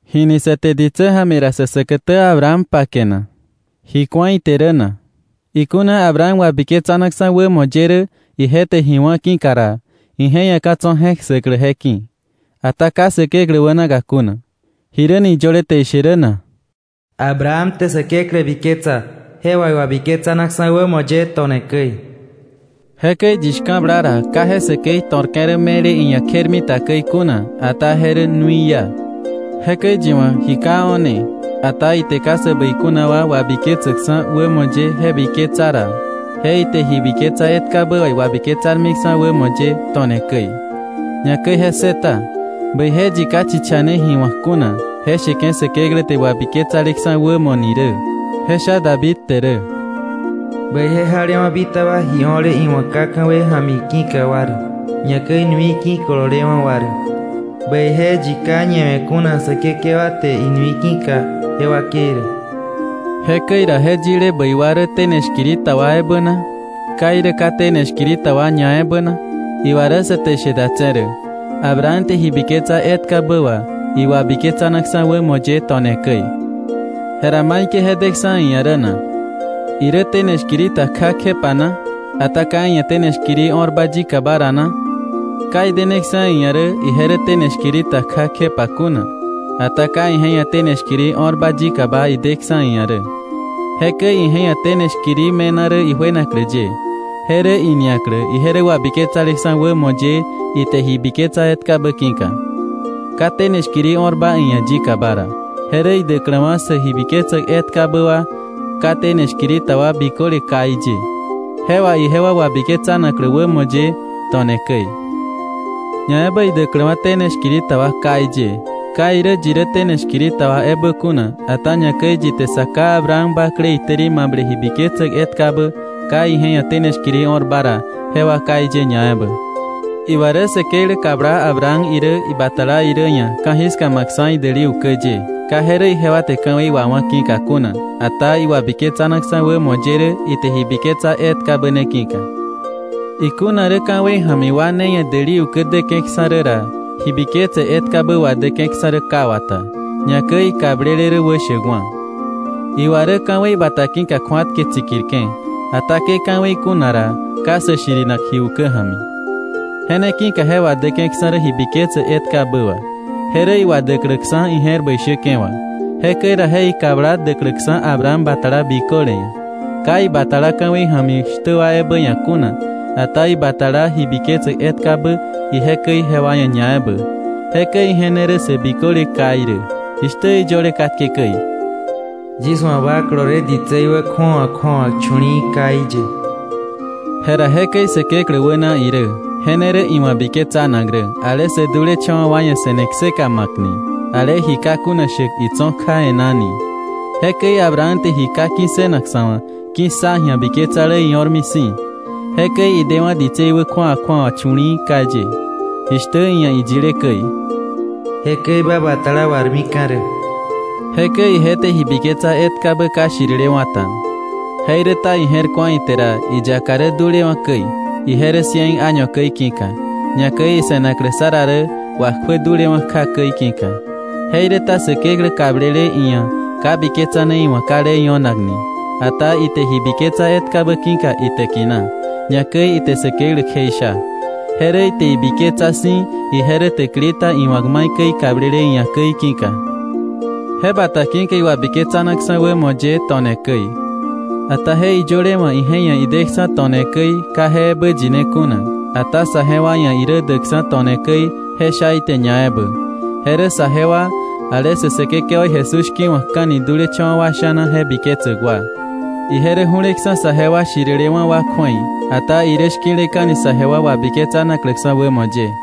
¿Jini sä te ditsä ja̱mi ra sä säkätä Abraham pake na? ¿Ji ku̱a ite rä na? Ikuna Abraham wabiketsanaksa̱ wämo ye rä ije te ji wá̱ ki̱ka ra, ije ia̱ ka̱ tso̱ je̱k ssäklä je ki̱, ata ka Säkeklä wänaka kuna. ¿Jiräni iyöle te ishe rä na? “Abraham te Säkeklä biketsa, je wà iwabiketsanaksa̱ wämo ye to̱ne käi.” Jekäi yi shka̱bla ra, ka je säkei to̱rke̱ rä me̱le iia̱ kjermita käi kuna, ata je rä nui iá. Jekäi yi wa̱ ji ka o̱ne, ata ite ka sä bäi kuna wa wabiketsäkksa̱ wämo ye je biketsa ra, je ite ji biketsa etkabä wà iwabiketsarmiksa̱ wämo ye to̱ne käi. Ñakäi je ssëta, bäije yi ka chichane ji wa̱k kuna je sheke̱ Säkeklä te wabiketsaleksa̱ wämo ni rä, je sha David te rä: “Bäije jalewa̱ bitaba ji o̱le iwa̱ ka ka̱wei ja̱mi ki̱ka wa rä, ñakäi nui ki̱kololewa̱ wa rä. Bäije yi ka ñawe̱ kuna Säkekewa te inui ki̱ka je wakei rä.” Jekäi ra, ¿je yile bäi wa rä tene shkiri ta wa ebä na? ¿Ka irä ka tene shkiri ta wa ñaebä na? Iwa rä sa te ishe datse̱ rä Abraham te ji biketsa etkabä wà iwabiketsanaksa̱ wämo ye to̱ne käi. Jera ¿maikäi je deksa̱ iia̱ rä na? ¿Irä tene shkiri ta kja kjepa na, ata ka iia̱ tene shkiri o̱rba yikaba ra na? Ka ideneksa̱ iia̱ rä ije rä tene shkiri ta kja kjepa kuna, ata ka ije ia̱ tene shkiri o̱rba yikaba ideksa̱ iia̱ rä. Jekäi ije ia̱ tene shkiri me̱na rä ijuenaklä ye, je rä iniaklä ije rä wabiketsaleksa̱ wämo ye ite ji biketsa etkabä ki̱ka, ka tene shkiri o̱rba iia̱ yikaba ra, je rä idäkläwa̱ sä ji biketsäk etkabä wà ka tene shkiri ta wa biköle káí ye, je wà ijewa wabiketsanaklä wämo ye to̱ne käi, ñaebä idäkläwa̱ tene shkiri ta wa káí ye, ka irä yi rä tene shkiri ta wa ebä kuna, ata ñakäi yi te sa ká Abraham bakle itäri mable ji biketsäk etkabä ka ije ia̱ tene shkiri o̱rba ra, jewa káí ye ñaebä. Iwa rä Säkeklä kabla Abraham irä ibatala irä ia̱ ka̱jiska ma̱ksa̱ idäli ukä ye, ka je rä ijewa te ka̱wei wawá̱ ki̱ka kuna, ata iwabiketsa̱naksa̱ wämo ye rä ite ji biketsa etkabä ne ki̱ka. Ikuna rä ka̱wei ja̱mi wa ne ia̱ däli ukä däke̱ksa̱ rä ra, ji biketse etkabä wadäke̱ksa̱ rä ka wata, ñakäi ikablele rä wäshäkwa̱. Iwa rä ka̱wei bata ki̱ka kju̱atke tsikirke̱. Ata ke ka̱wei kuna ra, ka sä shirinak ji ukä ja̱mi. Je ne ki̱ka je wadäke̱ksa̱ rä ji biketse etkabä wà, je rä iwadäkläksa̱ ije̱r bäi shäke̱ wà, jekäi ra je ikabla däkläksa̱ Abraham batala biköle ia̱, ka ibatala ka̱wei ja̱mi shtä wa ebä ia̱ kuna, ata ibatala ji biketsäk etkabä ije käi jewa ia̱ ñaebä. Jekäi ije ne rä sä biköle káí rä, jishtä iyöle katke käi: “Yis wa̱ ba kolole ditsei wä kju̱awa kju̱awa chu̱li̱i̱ káí ye.” Jera jekäi Säkeklä wäna irä, je ne rä iwa̱ biketsanak rä, ale sä dulecha̱wa̱ wa ia̱ se̱ne kseka ma̱kni, ale ji ka kuna shäk itso̱ kja e̱ná ni. Jekäi Abraham te ji ka ki̱ssënak sa̱ wa̱, ki̱ssa ji̱a biketsale io̱rmi si̱. Jekäi idewa̱ ditsei wä kju̱awa kju̱awa chu̱li̱i̱ káí ye, jishtä iia̱ iyile käi: “Jekäi ba batala warmika̱ rä”. Jekäi ije te ji biketsa etkabä ka shtirilewa̱ ta. Jeiräta ije je̱r ku̱a ite ra iyaka rä dulewa̱ käi, ije rä cien año käi ki̱ka, ñakäi ise̱naklä Sara rä wakjuä dulewa̱ kja käi ki̱ka. Jeiräta Säkeklä kablele iia̱ ka biketsane iwa̱ ka le io̱nak ni, ata ite ji biketsa etkabä ki̱ka itäkina, ñakäi ite Säkeklä kjeisha, je rä ite ibiketsa si̱ ije rä täkili ta iwa̱k maikäi ikablele iia̱ käi ki̱ka. Je bata ki̱ka iwabiketsanaksa̱ wämo ye to̱ne käi. Ata je iyöle wa̱ ije ia̱ ideksa̱ to̱ne käi ka je ebä yine kuna, ata saje wa ia̱ irä däkksa̱ to̱ne käi, je sha ite ñaebä. Je rä saje wa, ale sä Säkekewaí Jesús shki̱wa̱kka̱ni dulecha̱wa̱ wa sha̱na je biketsäk wa. Ije rä ju̱leksa̱ saje wa shirilewa̱ wa kju̱ei, ata irä shki̱leka̱ni saje wa wabiketsanakläksa̱ wämo ye.